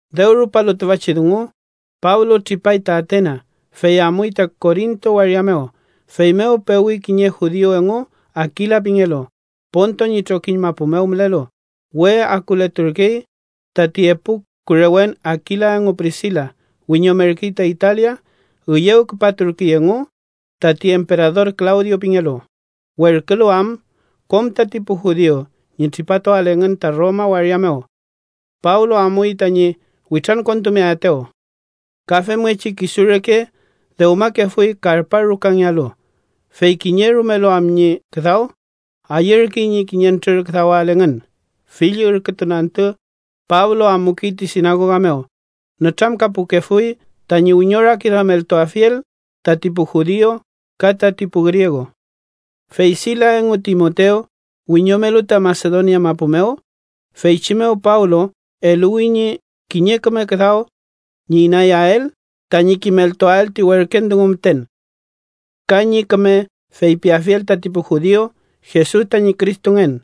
Dew rupalu tüfachi dungu, Pablo tripay ta Atena, fey amuy ta Korinto waria mew. Feymew pewi kiñe judiu engu Akila pingelu, Ponto ñi trokiñ mapu mew mülelu. We akuleturkey, tati epu kurewen Akila engu Prisila wiñomerkey ta Italia. Üyew küpaturkey engu, tati emperador Klawdio pingelu, werkülu am kom tati pu judiu ñi tripatuael engün ta Roma waria mew. Pablo amuy tañi witrankontumeaetew. Ka femngechi kisu reke dewmakefuy karpa rukangealu, fey kiñe rumelu am ñi küdaw, ayürkey ñi kiñentrür küdawael engün. Fill ürkütun antü Pablo amukey ti sinagoga mew, nütramkapukefuy tañi wiñorakiduameltuafiel tati pu judiu ka tati pu griegu. Fey Silas engu Timotew wiñomelu ta Masedonia mapu mew, feychi mew Pablo eluwi ñi kiñe rume küdaw ñi inayael tañi kimeltuael ti werken dungu müten, ka ñi küme feypiafiel tati pu judiu Jesus tañi Cristongen.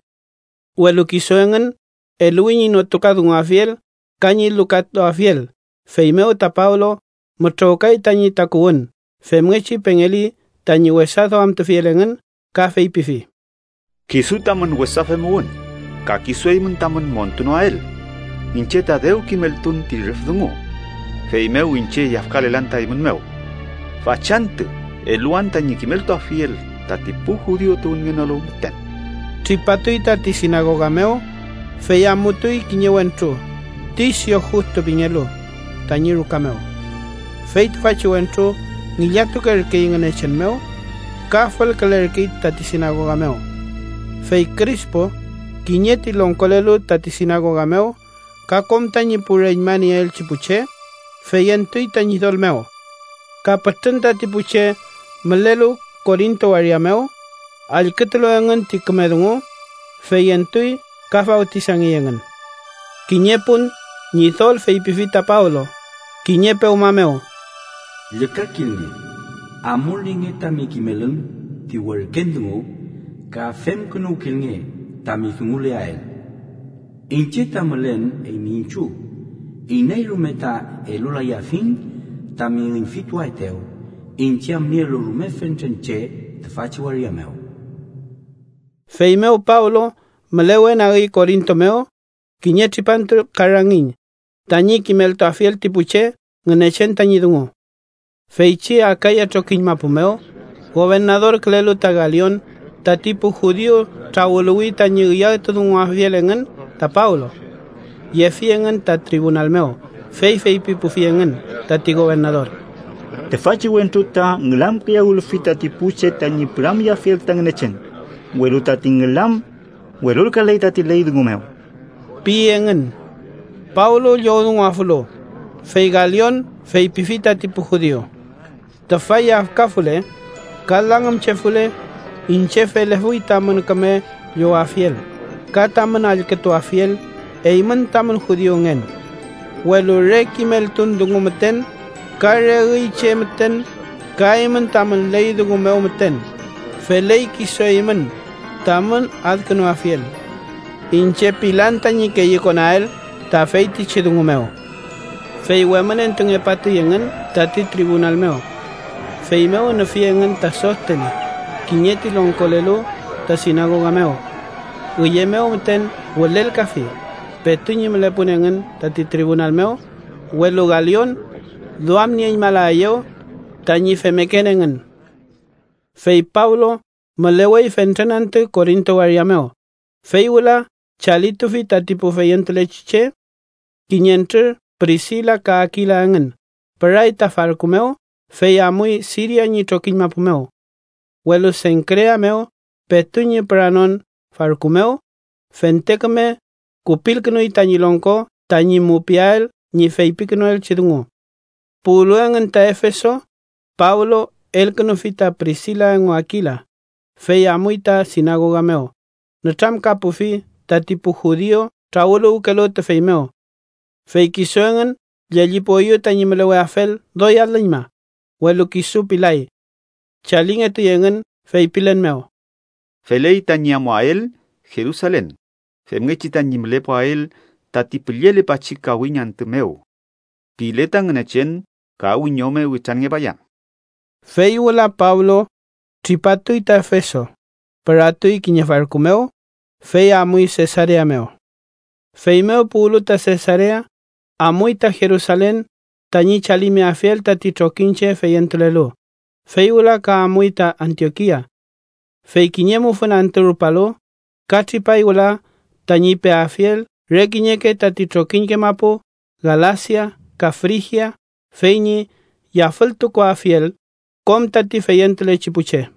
Welu kisu engün eluwi ñi notukadunguafiel ka ñi lukatuafiel, feymew ta Pablo mütrowkay tañi takuwün. Femngechi pengeli tañi wesa duamtufiel engün ka feypifi: —Kisu tamün wesa femuwün ka kisu eymün tamün montunoael, iñche ta dew kimeltun ti rüf dungu, feymew iñche yafkalelan ta eymün mew. Fachantü eluwan tañi kimeltuafiel tati pu judiu tuwünngenolu müten. Tripatuy tati sinagoga mew, fey amutuy kiñe wentru, Tisio Justu pingelu, tañi ruka mew. Fey tüfachi wentru ngillatukerkey Ngünechen mew ka fülkülerkey tati sinagoga mew. Fey Krispu, kiñe ti longkolelu tati sinagoga mew, ka kom tañi pu reñma nieelchi pu che, feyentuy ta Ñidol mew. Ka pütrün tati pu che mülelu Korinto waria mew, allkütulu engün ti küme dungu, feyentuy ka fawtisangey engün. Kiñe pun, Ñidol feypifi ta Pablo, kiñe pewma mew: “Llükakilnge. Amulnienge tami kimelün ti werken dungu ka femkünuwkilnge tami dunguleael. Iñche ta mülen eymi iñchiw. Iney rume ta elulayafiñ tami üñfituaetew, iñche am nielu rume fentren che tüfachi waria mew.” Feymew Pablo mülewenagi Korinto mew kiñe tripantu ka rangiñ, tañi kimeltuafiel ti pu che Ngünechen tañi dungu. Feychi Akaya trokiñ mapu mew gobernadorkülelu ta Galion, tati pu judiu trawüluwi tañi üyawtudunguafiel engün ta Pablo. Yefi engün ta tribunal mew, fey feypipufi engün tati gobernador: —Tüfachi wentru ta ngülamkiyawülfi tati pu che tañi püramyeafiel ta Ngünechen, welu tati ngülam welulkaley tati ley dungu mew ―pi engün. Pablo llowdunguafulu, fey Galion feypifi tati pu judiu: —Tüfa yafkafule ka langümchefule, iñche felefuy tamün küme llowafiel ka tamün allkütuafiel eymün tamün judiungen. Welu re kimeltun dungu müten ka re üy che müten ka eymün tamün ley dungu mew müten, feley kisu eymün tamün adkünuafiel. Iñche pilan tañi keyükonael ta feytichi dungu mew. Fey wemünentungepatuy engün tati tribunal mew. Feymew nüfi engün ta Sostene, kiñe ti longkolelu ta sinagoga mew. Üye mew müten wülelkafi, petu ñi mülepun engün tati tribunal mew. Welu Galion duamnieñmalaeyew tañi femmeken engün. Fey Pablo mülewey fentren antü Korinto waria mew, fey wüla chalitufi tati pu feyentulechi che. Kiñentrür Prisila ka Akila engün püray ta farku mew, fey amuy Siria ñi trokiñ mapu mew. Welu Senkrea mew petu ñi püranon farku mew, fente küme kupilkünuy tañi longko tañi mupiael ñi feypikünuelchi dungu. Puwlu engün ta Efeso, Pablo elkünufi ta Prisila engu Akila, fey amuy ta sinagoga mew, nütramkapufi tati pu judiu trawüluwkelu tüfey mew. Fey kisu engün llellipueyew tañi müleweafel doy alüñma, welu kisu pilay. Chalingetuy engün feypilen mew: “Feley tañi amuael Jerusalen femngechi tañi mülepuael tati püllelepachi kawiñ antü mew. Pile ta Ngünechen, ka wiñome witranngepayan.” Fey wüla Pablo tripatuy ta Efeso, püratuy kiñe farku mew, fey amuy Sesarea mew. Feymew puwlu ta Sesarea, amuy ta Jerusalen tañi chalimeafiel tati trokiñche feyentulelu, fey wüla ka amuy ta Antiokia. Fey kiñe mufün antü rulpalu, ka tripay wüla tañi peafiel re kiñeke tati trokiñke mapu Galasia ka Frigia, fey ñi yafültukuafiel kom tati feyentulechi pu che.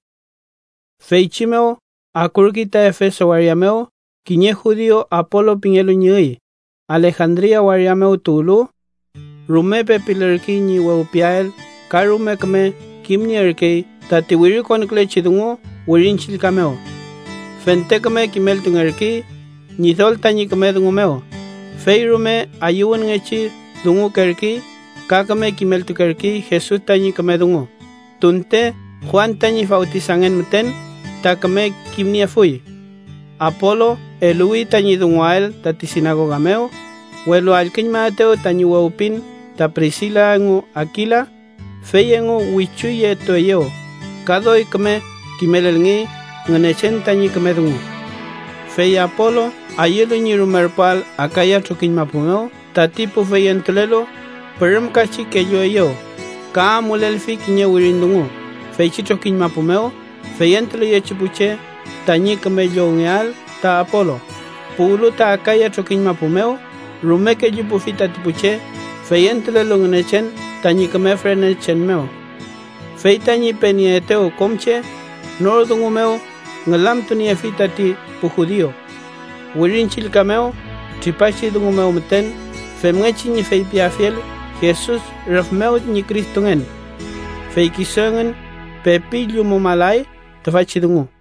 Feychi mew akurkey ta Efeso waria mew kiñe judiu Apolu pingelu ñi üy, Alejandria waria mew tuwlu. Rume pepilürkey ñi wewpiael ka rume küme kimnierkey tati wirikonkülechi dungu Wirin Chillka mew. Fente küme kimeltungerkey Ñidol tañi küme dungu mew, fey rume ayüwünngechi dungukerkey ka küme kimeltukerkey Jesus tañi küme dungu, tunte Juan tañi fawtisangen müten ta küme kimniefuy. Apolu eluwi tañi dunguael tati sinagoga mew, welu allküñmaetew tañi wewpin ta Prisila engu Akila, fey engu wichu yetueyew ka doy küme kimelelngey Ngünechen tañi küme dungu. Fey Apolu ayülu ñi rumerpuael Akaya trokiñ mapu mew tati pu feyentulelu pürümkachi kellueyew, ka amulelfi kiñe wirin dungu feychi trokiñ mapu mew feyentuleyechi pu che tañi küme llowngeael ta Apolu. Puwlu ta Akaya trokiñ mapu mew, rume kellupufi tati pu che feyentulelu Ngünechen tañi küme fürenechen mew. Fey tañi penieetew kom che, nor dungu mew ngülamtuniefi tati pu judiu Wirin Chillka mew tripachi dungu mew müten femngechi ñi feypiafiel Jesus rüf mew ñi Cristongen. Fey kisu engün pepi llumumalay tüfachi dungu.